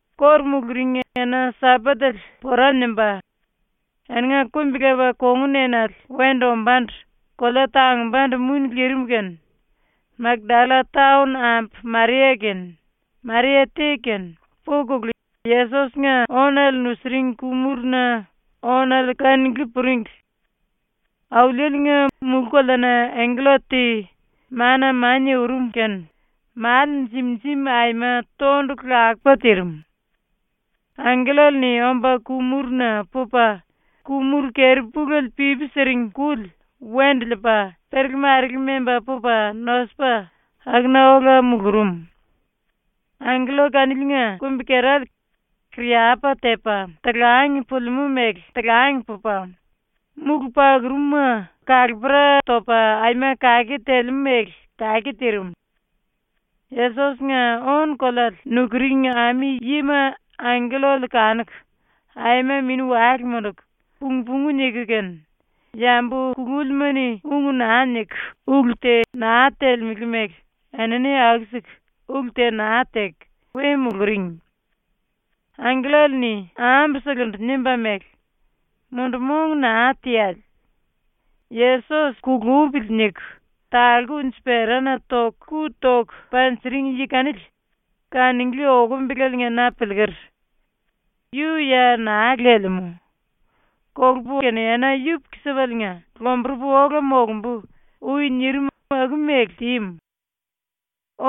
⸤Kóru muluring⸥ ena-Sambatele pora nimba, eninga kumbi-lepa kongun enale wendu ombándu kolea tangumbandu muni lirim kene Makdalla-taon ambu Maria kene, Maria te kene, pukulu ⸤Yesos-nga⸥ ónale nusiring ku-muruna ⸤ónale⸥ kanunglí puringli. Auliele-nga mulú-koleana angkella te mana-mania urum kene male jim-jim aima tondulu lakupa tirim. Angkellale-ni omba ku-muruna pupa ku-muru keri-puléle pipi siring kuli wendu liipa perele-marele memba pupa nosupa akuna ola mulurum. Angkella kaniliinga kumbi-kerale kariyapa tepa talang pulimú mele talang pupa, múlu pakurum-ma kalapera topa aima kake telemú mele kake tirim. Yesos-nga ónu-koleale nukuring ami-yima angkellale kanuku aima mini-wale munduku pung-pungu niku kene yambu kulúlima-ni ung naa niku ulu te naa telemele mele enini aku-siku ulu te naa teku we muluring. Angkellale-ni ambuselendu nimba mele: “Mundu-mong naa teale. Yesos ‘Kulupili.’ niku talku unji-perana ⸤toku⸥ ku toku panjiring yi kanili kanunglí okumbele na piliiker. Yu ya naa lelemú. ⸤“Kolupu kene ena yupuku-sipaliinga⸥ lomburupu ola molumbu.” ui nirim aku-mele tímu.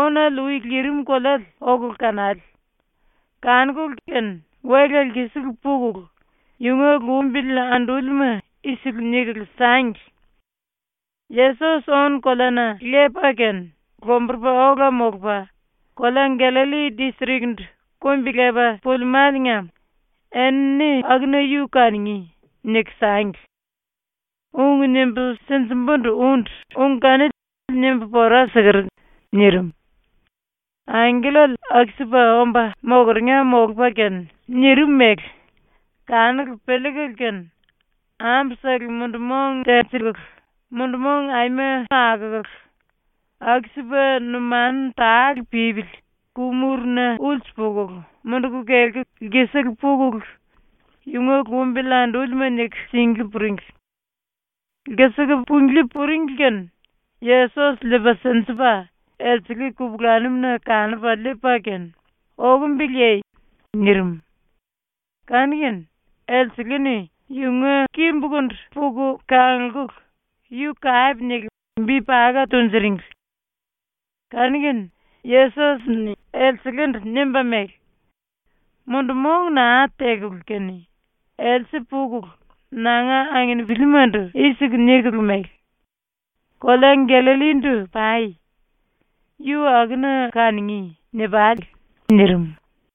Ónale ui lirim koleale okulu kanale. Kanukulu kene wela lkisiku pukulu yunga lumbili andúlima i-siku nikulu sangli: “Yesos ónu-koleana lepa kene lomburupa ola molupa kolea Gallalli distrik-ndu kumbi-lepa pulimáliinga enini akuna yu kanungí.” niku sangli. ⸤Ung nimbu sinjimbúndu úndu⸥ ung kanili nimbu pora siker.” nirim. ⸤Angkellale aku-sipa omba mokeringa molupa kene nirim mele⸥ kanuku piliikulu kene ambusele mundu-mong tenjikulu mundu-mong aima akukulu, aku-sipa numanu tale pípili ku-muruna ulsu pukulu munduku kelku lkisiku pukulu yunga lumbili andúlima niku singlí puringli. ⸤Lkisiku punglí puringli kene⸥ Yesos liipa sinjipa elsele kupulanum-na kanupa liipa kene “Okombeleye?” nirim. Kanu-kene elsele-ni yunga kimbukundu puku kanglkulu yu kape niku bi paka tunjuringli. Kanu-kene Yesos-ni elselendu nimba mele: “Mundu-mong naa tekulu kene, else pukulu nanga anginipilimandu i-siku nikulu mele: “Kolea Gallallindu pai. Yu akuna kanungí.” ni-pale.” nirim.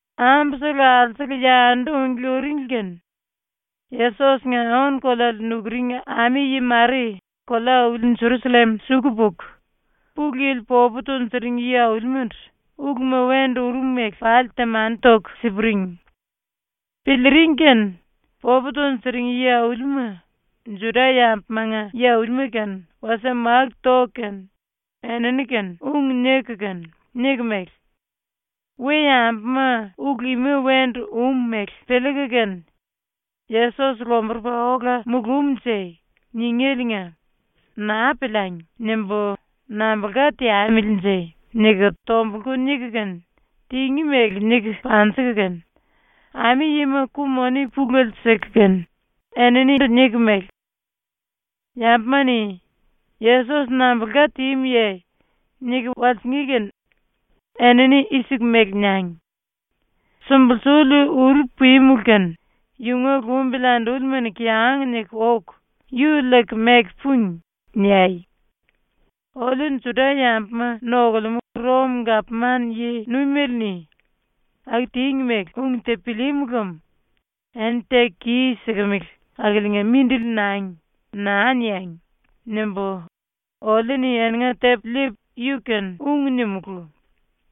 Ambusele alsukulu yandu unglí uringli kene Yesos-nga ónu-koleale nukuring ami-yi mare kolea-auli ⸤Jerusallem⸥ suku puku Pulu Yili popu tunjuring yi-aulimandu uluma wendu urum mele pali temani toku si-puring. ⸤Piliiring kene⸥ popu tunjuring yi-aulima, Juda-yambumanga yi-aulima kene wasie máku toku kene enini-kene ⸤ung niku kene niku mele: “We-yambuma ulu ima wendu um mele piliiku kene “Yesos lomburupa ola mulumnje.” ningéliinga ‘Naa piliangi.’ nimbu nambulka teamilinje?” niku⸥ tombulku niku kene tingí mele niku panjiku kene, ami-yima ku-moni pulele siku kene eninindu niku mele: “Yambuma-ni “Yesos nambulka tímuye?” niku walsingí kene enini i-siku mele niangi: “Sumbulsuli uru pímulu kene yunga lumbili andúlima-ni kiyang niku oku yu liiku meku púngi.” niai. ⸤Oliu Juda-yambuma nokulemú Rom-⸥gapman yi-nuimele-ni ⸤aku tíngi mele⸥ ung te pilíímu lem ‘ “Eni teku kis-sikimili akiliinga mindili nangi.” naa niangi!’ nimbu oliu-ni eninga tepu liipu yu-kene ung nimulú,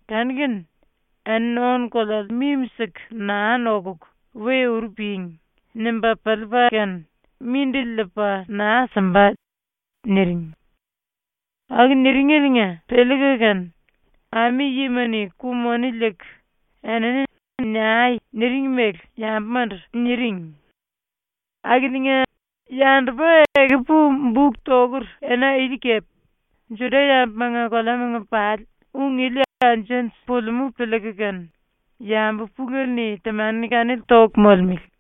kanu-kene ‘Eni ónu-koleale mimi-siku naa nokuku we uru ping.’ nimba piliipa kene mindili liipa naa simba.” niring. Aku niringeliinga piliiku kene ami-yima-ni ku-moni liiku enini “Niai.” niring mele yambumandu niring. Akiliinga yandupa ekupu ⸤buk tokur⸥ ena ili kepe Juda-yambumanga koleamanga pali ung ili anju-anju pulimú piliiku kene yambu pulele-ni temani kanili toku molemele.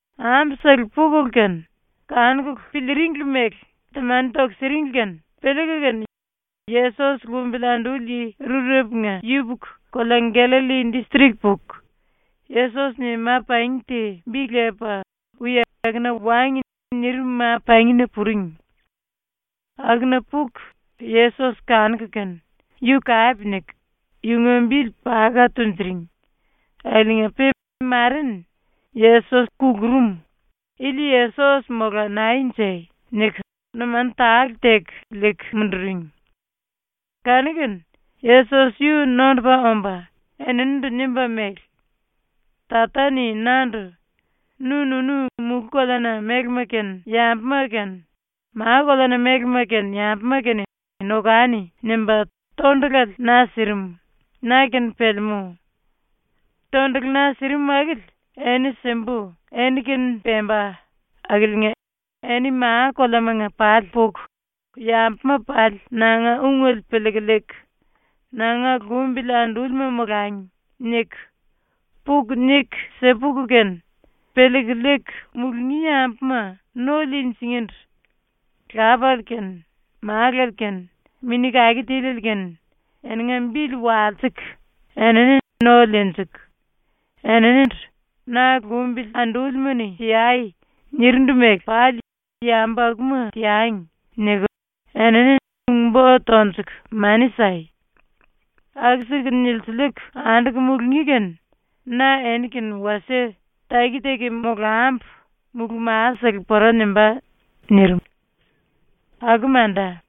⸤Ambusele pukulu kene kanukulu piliiringli mele temani toku siringli⸥ kene piliiku kene Yesos lumbili anduli yi rurepunga yupuku kolea Gallalli distrik puku, Yesos-ni ma-pangi te bi lepa ui “Akuna wangi.” nirim ma-pangina puring. Akuna puku Yesos kanuku kene, yu kape niku yunga bili paka tunjuring akiliinga-pe mare-ni ‘Yesos kulurum. Ili Yesos mola naenje?’ niku numanu tale teku liiku munduring. Kanu-kene Yesos yu nondupa omba eninindu nimba mele: “Tata-ni nandu “Nu-nunu mulú-koleana mélema kene yambuma kene, ma-koleana mélema kene yambuma kene nokani.” nimba tondulale na sirim, na-kene pelemú. ⸤Tondulu na sirim akili eni simbu eni-kene pemba⸥ akiliinga eni ma-koleamanga pali puku ‘Yambuma pali nanga ungele piliiku liiku, nanga lumbili andúlima molangi.’ niku, puku niku si-puku kene, ⸤piliiku liiku mulungí⸥ yambuma no liinjingíndu Lapale kene Málale kene Mini Kake Tiliele kene eninga bili walsiku enini no liinjiku, eninindu “Na lumbili andúlima-ni teai.” nirindu mele pali ‘Yambu akuma teangi.’ niku enini ung-bo tonjuku mani sai. Aku-siku nilsiliiku anduku mulungí kene na eni-kene wasie taki-taki molambu mulú-masele pora nimbá.” nirim. ⸤Aku manda.⸥